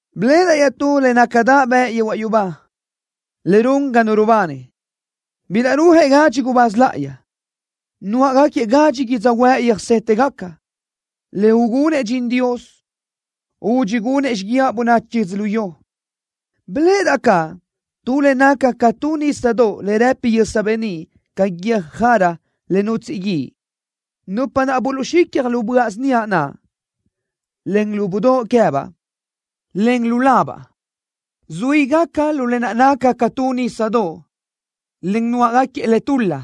Biléʼedaʼ iaʼtú le nácadaʼ bëʼ yehuaʼ yubá, le run ga nu rubani. Bilaʼrúajëʼ gadxi gubáz láʼayi, nuáʼagaquiëʼ gadxi yödzöhuë́ʼ röjsétegaca, le ugunëʼ dxin Dios, údxi gunëʼ xíguiaʼ bönachi yödzölió. Biléʼedaʼ caʼ tu le naca ca tu nísadoʼ le rëpi yösa beníʼ ca guiö́j jara le nutsíʼi guíʼ. Nupa naʼ buluʼxicja lu böaʼ síniaʼ naʼ, en lu budóʼ queë́baʼ, en lu labaʼ, zuígaca lu lë naʼ naca ca tu nísadoʼ, en nuáʼagaquiëʼ le tul-la,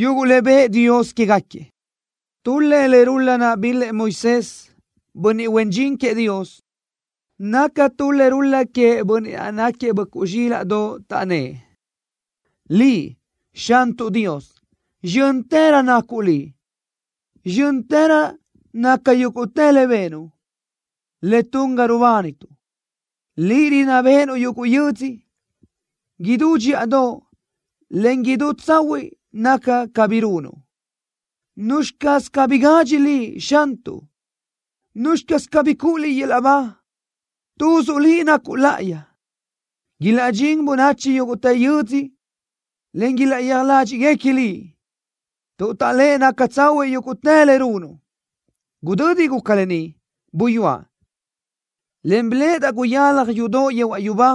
yuguʼ le bëʼë Dios quégaquiëʼ. Tul-lëʼ le rul-la naʼ bil-lëʼ Moisés, bönniʼ huen dxin queëʼ Dios. Naca tu le rul-la queëʼ Bönniʼ naʼ náquiëʼ Böʼcuʼ Zxílaʼdoʼ. Taʼnnë́ʼ: ¡Liʼ, Xantuʼ Dios, zxö́ntërö nacuʼ Liʼ! ¡Zxö́ntërö naca yúguʼtë le benuʼ, le tun ga rubánituʼ! ¡Liʼ rinná béʼenuʼ yuguʼ yödzö! ¡Idú dxíʼadoʼ, en idú tsahuiʼ naca ca bi runuʼ! ¿Nuzxi caz cabí gadxi Liʼ, Xantuʼ? ¿Nuzxi caz cabí cuʼu Liʼ yöl-laʼ ba? ¡Tuzuʼ Liʼ nacuʼ láʼayi! ¡Ilaʼdxín bönachi yúguʼtë yödzö, en ilaʼyéaj ládxiʼguequi Liʼ tuʼ taʼléʼe naca tsahuiʼ yúguʼtë le runuʼ! Gudödi guca lë ni, buyúaʼ, en biléʼedaʼ guyalaj yudoʼ yehuaʼ yubá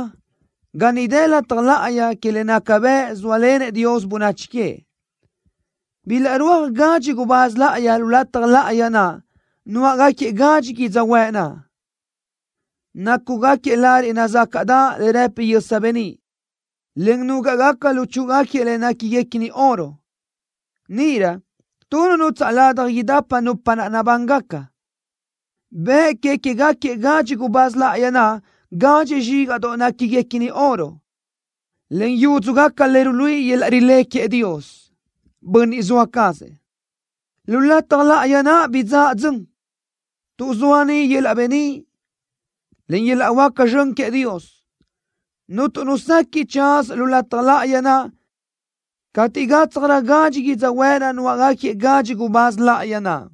ga niʼ dë lataj láʼayi que le naca bëʼ zóalenëʼ Dios bönachi queëʼ. Bilaʼrúajëʼ gadxi gubáz láʼayi lu lataj láʼayi naʼ, nuáʼagaquiëʼ gadxi yödzöhuë́ʼ naʼ. Nácugaquiëʼ lariʼ nazácaʼdaʼ le rëpi yösa beníʼ, en núgaʼgaca luchúʼugaquiëʼ le néquiguequini oro. Níʼirö tu nu nutsaʼ ladaj idapa nupa naʼ nabángaca, bëʼ que queë́gaquiëʼ gadxi gubáz láʼayi naʼ gadxi zxígaʼdoʼ néquiguequini oro, en yúdzugaca le ruluíʼi yöl-laʼ rilé queëʼ Dios, Bönniʼ zoa cazëʼ. Lu lataj láʼayi naʼ bidzáʼa dzön, tuʼ zoa niʼ yöl-laʼ beníʼ, en yöl-laʼ huáca zxön queëʼ Dios. Cuntu nu sequiʼ tsaza lu lataj láʼayi naʼ cateʼ gátsjarö gadxi yödzöhuë́ʼ naʼ nuáʼagaquiëʼ gadxi gubáz láʼayi naʼ.